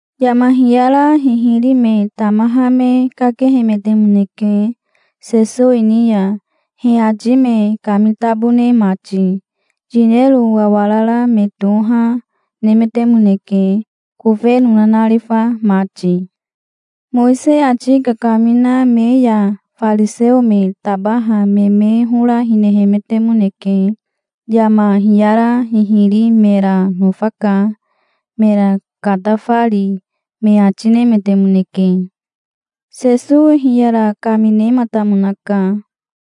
Yama hiyara hihiri me tamaha me kakehemetemoneke Sesowi ni ya, he ati me kamitabone mati. Yinero wawarara me toha, nemetemoneke, kofeno nanarifa mati. Mowisei ati kakamina me ya fariseo me tabaha me me hora hinehemetemoneke. "Yama hiyara hihiri mera nofaka, mera katafari", me ati nemetemoneke. Sesowi hiyara kaminematamonaka.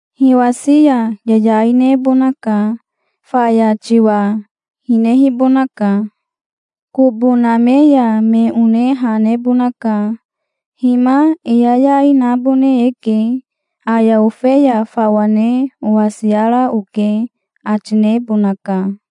Hiwasi ya yayai nebonaka. Faya tiwa hinehibonaka. Kobo name ya me one ha nebonaka. 'Hima e yayai nabone eke. Aya ofeya fawa ne owasiara oke', ati nebonaka.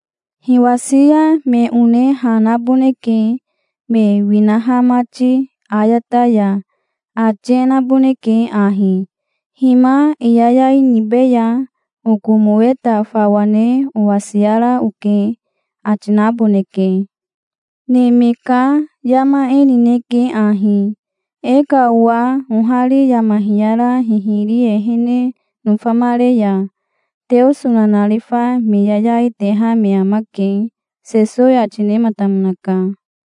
Hiwasi ya me one ha naboneke, me winaha mati ayata ya. Ati e naboneke ahi: 'Hima e yayai nibeya. Oko moweta fawa ne owasiara oke', ati naboneke. Neme ka yama e nineke ahi. E ka owa ohari yama hiyara hihiri ehene nofamare ya Teoso nanarifa me yayai teha me amake", Sesowi ati nematamonaka.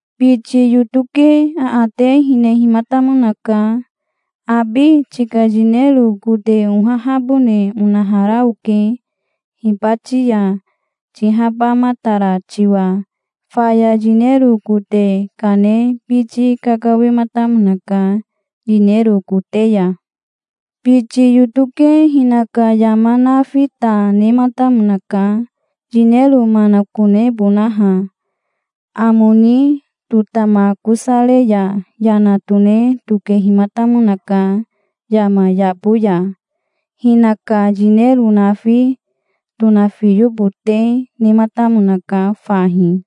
Biti yoto ke aate hinehimatamonaka. 'Abi tika yinero kote ohahabone onahara oke hibati ya, tihabamatara tiwa'. Faya yinero kote kane biti kakawematamonaka, yinero kote ya. Biti yoto ke hinaka yama nafi ta nematamonaka, yinero manakonebonaha. Amo ni totamakosare ya yana tone tokehimatamonaka yama yabo ya. Hinaka yinero nafi tonafiyobote nematamonaka fahi".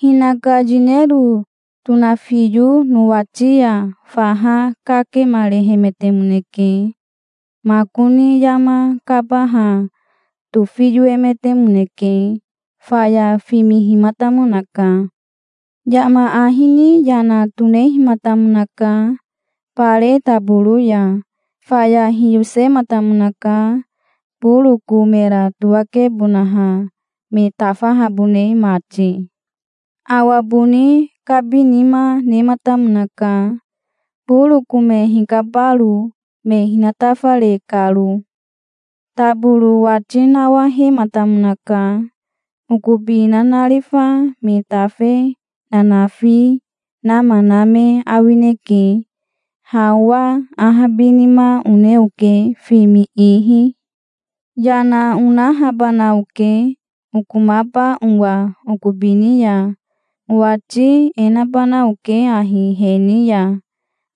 "Hinaka yinero tonafiyo nowati ya faha kakemarehemetemoneke. Makoni yama kabaha tofiyoemetemoneke. Faya fimihimatamonaka. Yama ahi ni yana tonehimatamonaka, bare taboro ya. Faya hiyosematamonaka boroko mera towakebonaha me tafahabone mati. Awa boni kabinima nematamonaka boroko me hikabaro, me hinatafare karo. Taboro wati nawahematamonaka. 'Okobi nanarifa me tafe nanafi nama na me awineke. Ha owa ahabinima one oke fimi ihi. Yana onahabana oke okomaba owa okobi ni ya. Owati e nabana oke ahi he ni ya: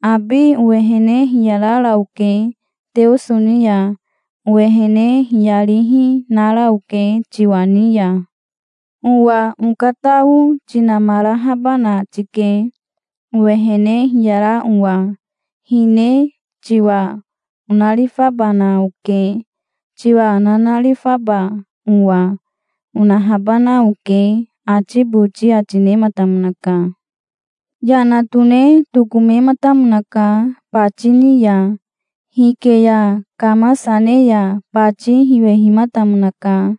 "Abi owehene hiyarara oke Teoso ni ya. Owehene hiyarihi nara oke tiwa ni ya. Owa okatao tinamarahabana tike, owehene hiyara owa. Hine tiwa onarifabana oke, tiwa nanarifaba owa", onahabana oke', ati boti ati nematamonaka". "Yana tone tokomematamonaka bati ni ya. Hike ya kamasa ne ya bati hiwehimatamonaka.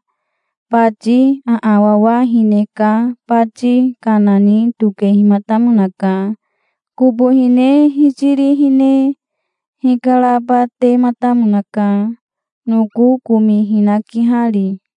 Bati aawawa hine ka bati kana ni tokehimatamonaka. Kobo hine hitiri hine hikarabatematamonaka, noko komi hinakihari".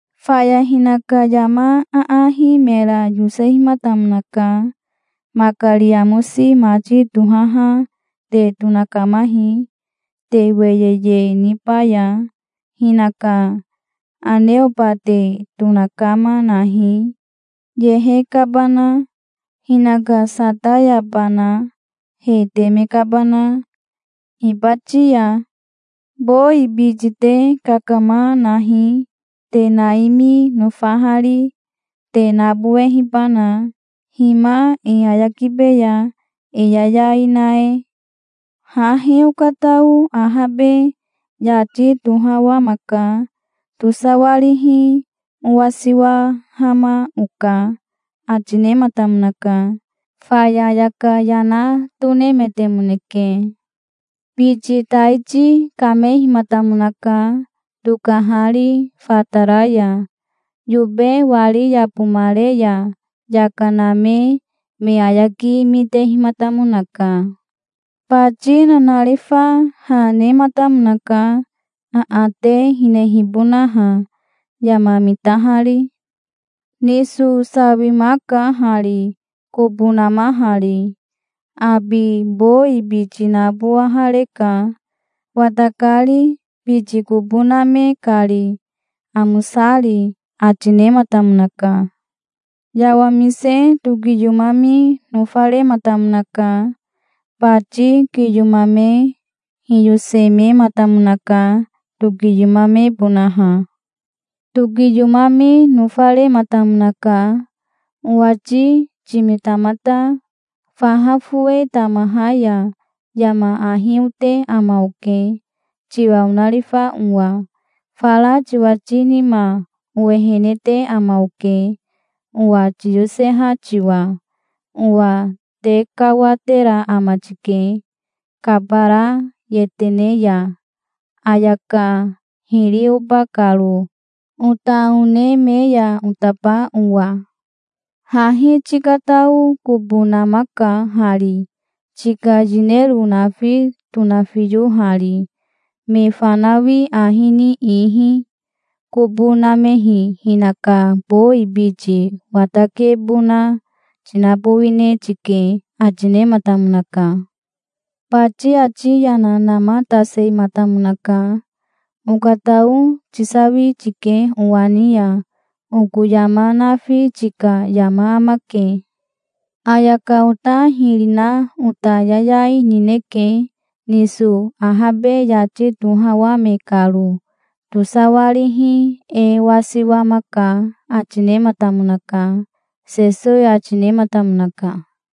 "Faya hinaka yama aahi mera yosehimatamonaka. 'Makari amosi mati tohaha te tonakamahi, te weyeye nibaya. Hinaka aneoba te tonakama nahi, yehe kabana. Hinaka satayabana, he teme kabana. Hibati ya! Bowi biti te kakama nahi, te naimi nofahari, te nabowehibana. Hima e ayakibeya, e yayai na e. Hahi okatao ahabe yati tohawamaka. Tosawarihi owasiwahama oka', ati nematamonaka. Faya ayaka yana tonemetemoneke". "Biti taiti kamehimatamonaka tokahari fatara ya. Yobe wari yabomare ya yaka name me ayaki mitehimatamonaka. Bati nanarifa ha nematamonaka, aate hinehibonaha, yama mitahari. 'Niso sawimaka hari, kobo namahari. Abi bowi biti nabowahareka, watakari, biti kobo name kari, amosari', ati nematamonaka". "Yawamise tokiyomami nofarematamonaka. Bati kiyomame hiyosemematamonaka tokiyomamebonaha. Tokiyomami nofarematamonaka. 'Owati timitamata. Faha fowe tamaha ya yama ahi ote ama oke, tiwa onarifa owa. Fara tiwati nima owehene te ama oke, owa tiyoseha tiwa. Owa tekawatera ama tike, kabara yetene ya, ayaka hiri oba karo, ota one me ya otaba owa. Hahi tikatao kobo namaka hari, tika yinero nafi tonafiyohari, me fanawi ahi ni ihi. Kobo namehi hinaka bowi biti watakebona tinabowine tike', ati nematamonaka". "Bati ati yana namatasematamonaka. 'Okatao tisawi tike owa ni ya. Oko yama nafi tika yama amake. Ayaka ota hiri na ota yayai nineke, niso ahabe yati tohawame karo. Tosawarihi e wasiwamaka', ati nematamonaka", Sesowi ati nematamonaka.